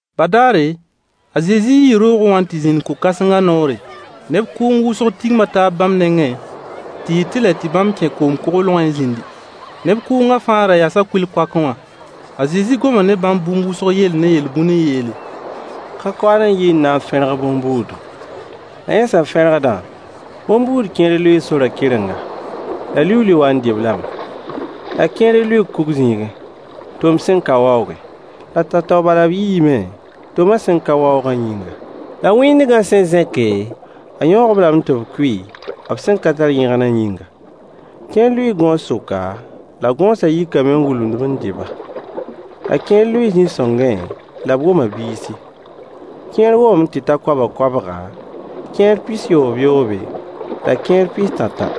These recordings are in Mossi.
Badaare, a Zezi yii roogẽ wã n tɩ zĩnd ko-kãsengã noore. Neb kʋʋng wʋsg tigma taab bãmb nengẽ tɩ yɩ tɩlɛ tɩ bãmb kẽ koom-koglgẽ n zĩndi. Neb kʋʋngã fãa ra yasa kʋɩl-koakẽ wã. A Zezi goma ne bãmb bũmb wʋsg yell ne yel-bũn n yeele: Ka-koaad n yi n na n fẽrg bõn-buudu. La yẽ sẽn fẽrgdã, bõn-buud kẽer lʋɩɩ sorã kɩrenga, la liuuli waa n dɩ-b lame. La kẽer lʋɩɩ kug zĩigẽ, tom sẽn ka waoogẽ. La tao-tao bala b yiime, toma sẽn ka waoogã yĩnga. La wĩndgã sẽn zẽke, a yõog-b lame tɩ b kʋɩ, b sẽn ka tar yẽgna yĩnga. Kẽer lʋɩɩ gõos sʋka, la gõosã yikame n wulumd-b n dɩ-ba. La kẽer lʋɩɩ zĩ-sõngẽ, la b woma biisi. Kẽer womame tɩ ta koabg-koabga, kẽer pis-yoobyoobe, la kẽer pis-tãtã.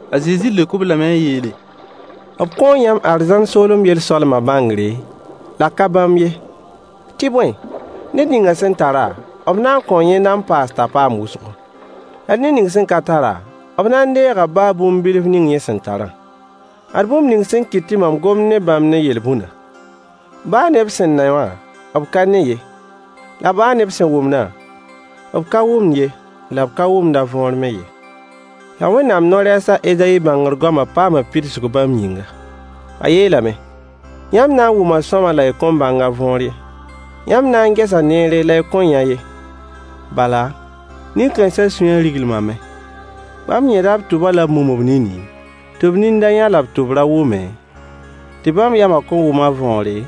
A Zezi leok-b lame n yeele: B kõo yãmb arzãn soolem yel-soalmã bãngre, la ka bãmb ye. Tɩ bõe, ned ning sẽn tara, b na n kõo yẽnda n paas t'a paam wʋsgo. La ned ning sẽn ka tara, b na n deega baa bũmb bilf ning yẽ sẽn tarã. Ad bũmb ning sẽn kɩt tɩ mam gomd ne bãmb ne yel-bũnã: baa ne b sẽn ne wã, b ka ne ye, la b sẽn wʋmdã, b ka wʋmd ye la b ka wʋmd võor me ye. La Wẽnnaam no-rɛɛs a Ezayi bãngr-goamã paama pidsg bãmb yĩnga. A yeelame: “Yãmb na n wʋma sõama la y kõn bãng a võor ye, yãmb na n gesa neere la y kõn yã ye. Bala nin-kãensã sũyã riglimame. Bãmb yẽda b tʋba la b mum b nini, tɩ b nin da yã la b tʋb ra wʋme, tɩ bãmb yamã kõn wʋm a võore,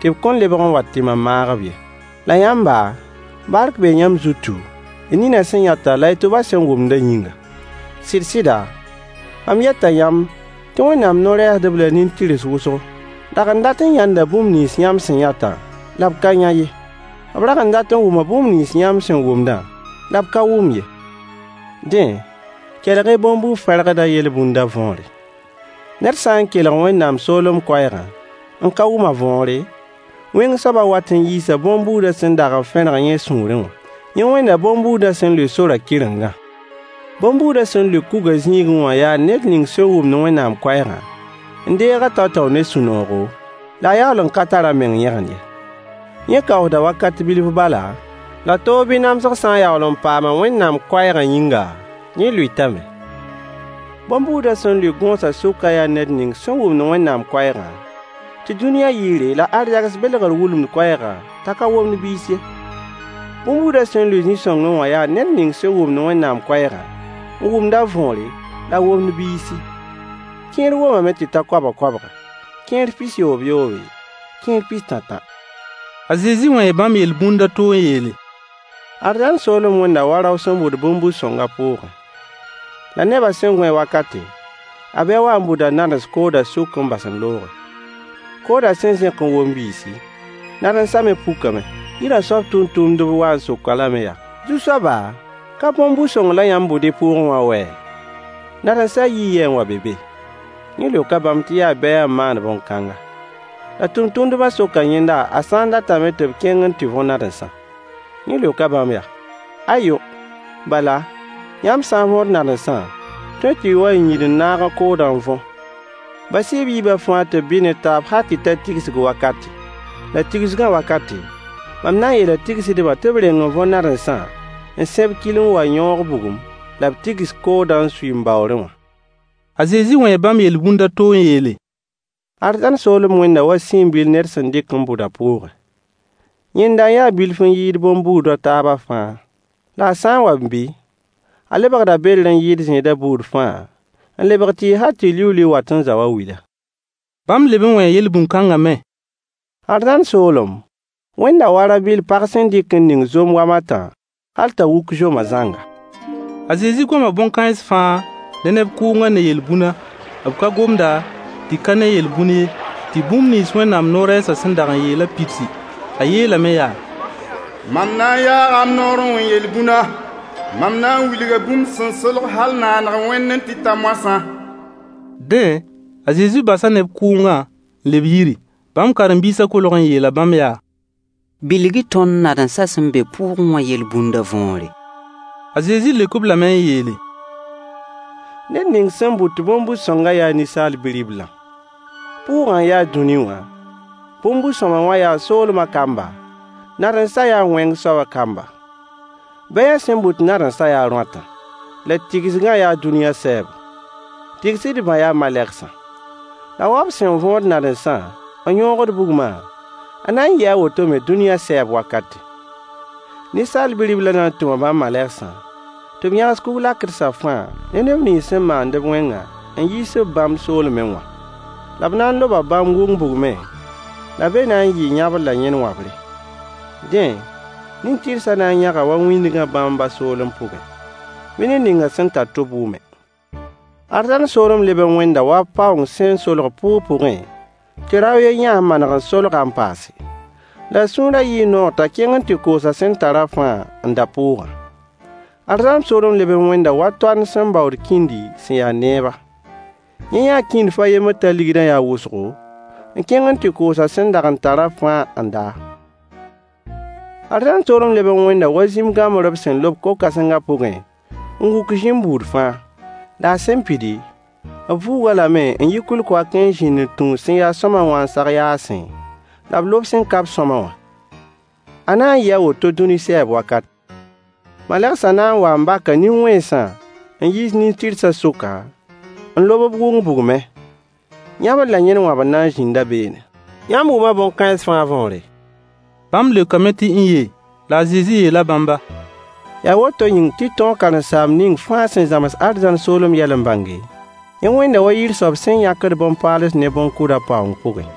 tɩ b kõn lebg n wa tɩ mam maag-b ye.” La yãmba, bark bee yãmb zutu, y ninã sẽn yãtã la y tʋbã sẽn wʋmdã yĩnga. Sɩd-sɩda, mam yeta yãmb tɩ Wẽnnaam no-rɛɛsdb la nin-tɩrs wʋsg dag n dat n yãnda bũmb nins yãmb sẽn yãtã la b ka yã ye. B dag n dat n wʋma bũmb nins yãmb sẽn wʋmdã la b ka wʋm ye. Dẽ, kelg-y bõn-bu-fẽrgdã yel-bũndã võore. Ned sã n kelg Wẽnnaam soolem koɛɛgã n ka wʋm a võore, wẽng soabã wat n yiisa bõn-buudã sẽn dag n fẽrg yẽ sũurẽ wã. Yẽ wẽnda bõn-buudã sẽn lʋɩ sorã kɩrengã. Bõn-buudã sẽn lʋɩ kugã zĩigẽ wã yaa ned ning sẽn wʋmd Wẽnnaam koɛɛgã n deeg-a tao-tao ne sũ-noogo, la a yaool n ka tar a meng yẽgen ye. Yẽ kaoosda wakat bilf bala, la toog bɩ namsg sã n yaool n paam-a Wẽnnaam koɛɛgã yĩnga, yẽ lʋɩtame. Bõn-buudã sẽn lʋɩ gõosã sʋkã yaa ned ning sẽn wʋmd Wẽnnaam koɛɛgã, tɩ dũniyã yɩɩre la arzegs belgr wulumd koɛɛgã t'a ka womd biis ye. Bõn-buudã sẽn lʋɩ zĩ-sõngẽ wã yaa ned ning sẽn wʋmd Wẽnnaam koɛɛgã n wʋmd a võore la a womd biisi. Kẽer womame tɩ ta koabg-koabga, kẽer pis-yoobyoobe, kẽer pis-tãtã. A Zezi wẽe bãmb yel-bũnd a to n yeele: Arzãn soolem wẽnda wa rao sẽn bʋd bõn-bu-sõng a pʋʋgẽ. La nebã sẽn gõe wakate, a bɛy waa n bʋda nadens koodã sʋk n bas n looge. Koodã sẽn zẽk n wom biisi, nadensã me pukame. Yirã soab tʋmtʋmdb waa n sok-a lame yaa: Zu-soaba, ka bõn-bu-sõng la yãmb bʋd y pʋʋgẽ wã wɛ? Nadensã yii yɛ n wa n be be? Yẽ leoka bãmb tɩ yaa bɛy n maan bõn-kãnga. La tʋmtʋmdbã soka yẽnda a sã n datame tɩ b kẽng n tɩ võ nadensã. Yẽ leoka bãmb yaa: Ayo! Bala, yãmb sã n võod nadensã, tõe tɩ y wa n yĩd n naag koodã n võ. Bas-y b yiibã fãa tɩ b bɩ ne taab hal tɩ ta tigsg wakate. La tigsgã wakate, mam na n yeela tigsdbã tɩ b reng n võ nadensã n sẽb kil n wa n yõog bugum, la b tigs koodã n sui m baoorẽ wã. A Zezi wẽe bãmb yel-bũnd a to n yeele: Arzãn soolem wẽnda wa siin-bil ned sẽn dɩk n bʋd a pʋʋgẽ. Yẽnda n ya bilf n yɩɩd bõn-buud a taabã fãa. La a sã n wa n bɩ, a lebgda bedr n yɩɩd zẽed buud fãa, n lebg tɩɩg hal tɩ liuuli wat n zao a wila. Bãmb leb n wẽe yel-bũn-kãngã me: Arzãn soolem wẽnda wa rã-bɩll pag sẽn dɩk n ning zom wam a tã hal t'a wuk zomã zãnga. A Zezi goma bõn-kãens fãa ne neb kʋʋngã ne yel-bũna. B ka gomda tɩ ka ne yel-bũn ye, tɩ bũmb nins Wẽnnaam no-rɛɛsã sẽn dag n yeelã pidsi. A yeelame yaa: Mam na n yaaga m noor n wẽ yel-bũna, mam na n wilga bũmb sẽn solg hal naaneg wẽndẽ tɩ ta moasã. Dẽ, a Zezi basa neb kʋʋngã n leb yiri. Bãmb karen-biisã kolg n yeela bãmb yaa: Bilg-y tõnd nadensã sẽn be pʋʋgẽ wã yel-bũndã võore. A Zezi leok-b lame n yeele: Ned ning sẽn bʋt bõn-bu-sõngã yaa Ninsaal Bi-riblã. Pʋʋgã n ya dũni wã, bõn-bu-sõamy wã yaa soolmã kamba, nadensã yaa wẽng soabã kamba. Bɛyã sẽn bʋd nadensã yaa rõatã. La tigsgã yaa dũniyã sɛɛbo. Tigsdbã yaa malegsã. La wa b sẽn võod nadensã n yõogd bugmã, a na n yɩɩ a woto me dũni sɛɛb wakate. Ninsaal Bi-riblã na n tʋma bãmb malegsã tɩ b yãgs kug-lakdsã fãa ne neb nins sẽn maand wẽngã n yiis-b bãmb soolmẽ wã. La b na n loba bãmb wʋng bugmẽ, la be na n yɩɩ yãbr la yẽn wãbre. Dẽ, nin-tɩrsã na n yãga wa wĩndgã bãmb ba soolem pʋgẽ. Bɩ ned ning sẽn tar tʋb wʋme. Arzãn soolem leb n wẽnda wa paoong sẽn solg pʋʋg pʋgẽ tɩ rao a yen yã-a n maneg n solg-a n paase. La a sũurã yɩɩ noog t'a kẽng n tɩ koos a sẽn tarã fãa n da pʋʋgã. Arzãn soolem leb n wẽnda wa toand sẽn baood kĩndi sẽn ya neeba. Yẽ yãa kĩndf a yembr t'a ligdã ya wʋsgo, n kẽng n tɩ koos a sẽn dag n tarã fãa n da-a. Arzãn soolem leb n wẽnda wa zĩm-gãmbr b sẽn lob ko-kãsengã pʋgẽ n wʋk zĩm buud fãa. La a sẽn pidi, b vuugd-a lame n yi kʋɩl-koakã n zĩnd n tũus sẽn ya sõama wã n sag yaasẽ, la b lob sẽn ka-b sõama wã. A na n yɩɩ a woto dũni sɛɛb wakate. Malegsã na n waa n baka nin-wẽnsã n yiis nin-tɩrsã sʋka, n lob-b wʋng bugmẽ. Yãbr la yẽn wãbr na n zĩnda beene. Yãmb wʋma bõn-kãens fãa võore? Bãmb leokame tɩ n-ye. La a Zezi yeela bãmba: Yaa woto yĩng tɩ tõog karen-saamb ning fãa sẽn zãms arzãn soolem yɛl n bãnge, yẽ wẽnda wa yir soab sẽn yãkd bõn-paals ne bõn-kʋd a paoong pʋgẽ.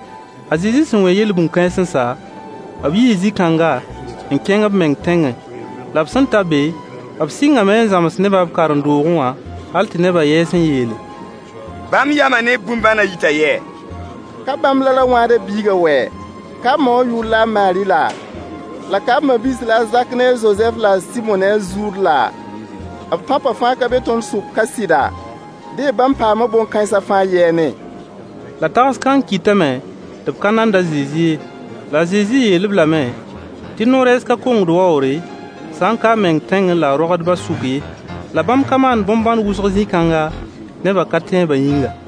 A Zezi sẽn wẽ yel-bũn-kãens n sa, b yii zĩ-kãnga n kẽng b meng tẽngẽ. La b sẽn ta be, b sɩngame n zãms nebã b karen-doogẽ wã, hal tɩ nebã yɛɛs n yeele: Bãmb yamã ne b bõn-bãnã yita yɛ? Ka bãmb la ra-wãadã biigã wɛ? Ka b ma wã yʋʋr la a Maari laa? La ka b ma-biis la a Zak ne a Zozɛf la a Sɩmo ne a Zuud laa? B tãopã fãa ka be tõnd sʋk ka sɩda? Dẽ, bãmb paama bõn-kãensã fãa yɛɛne? La tags-kãng kɩtame tɩ b ka nand a Zezi ye. La a Zezi yeel-b lame tɩ no-rɛɛs ka kongd waoogre, sã n ka a meng tẽngẽ la a roagdbã sʋk ye. La bãmb ka maan bõn-bãn wʋsg zĩ-kãnga, nebã ka-tẽebã yĩnga.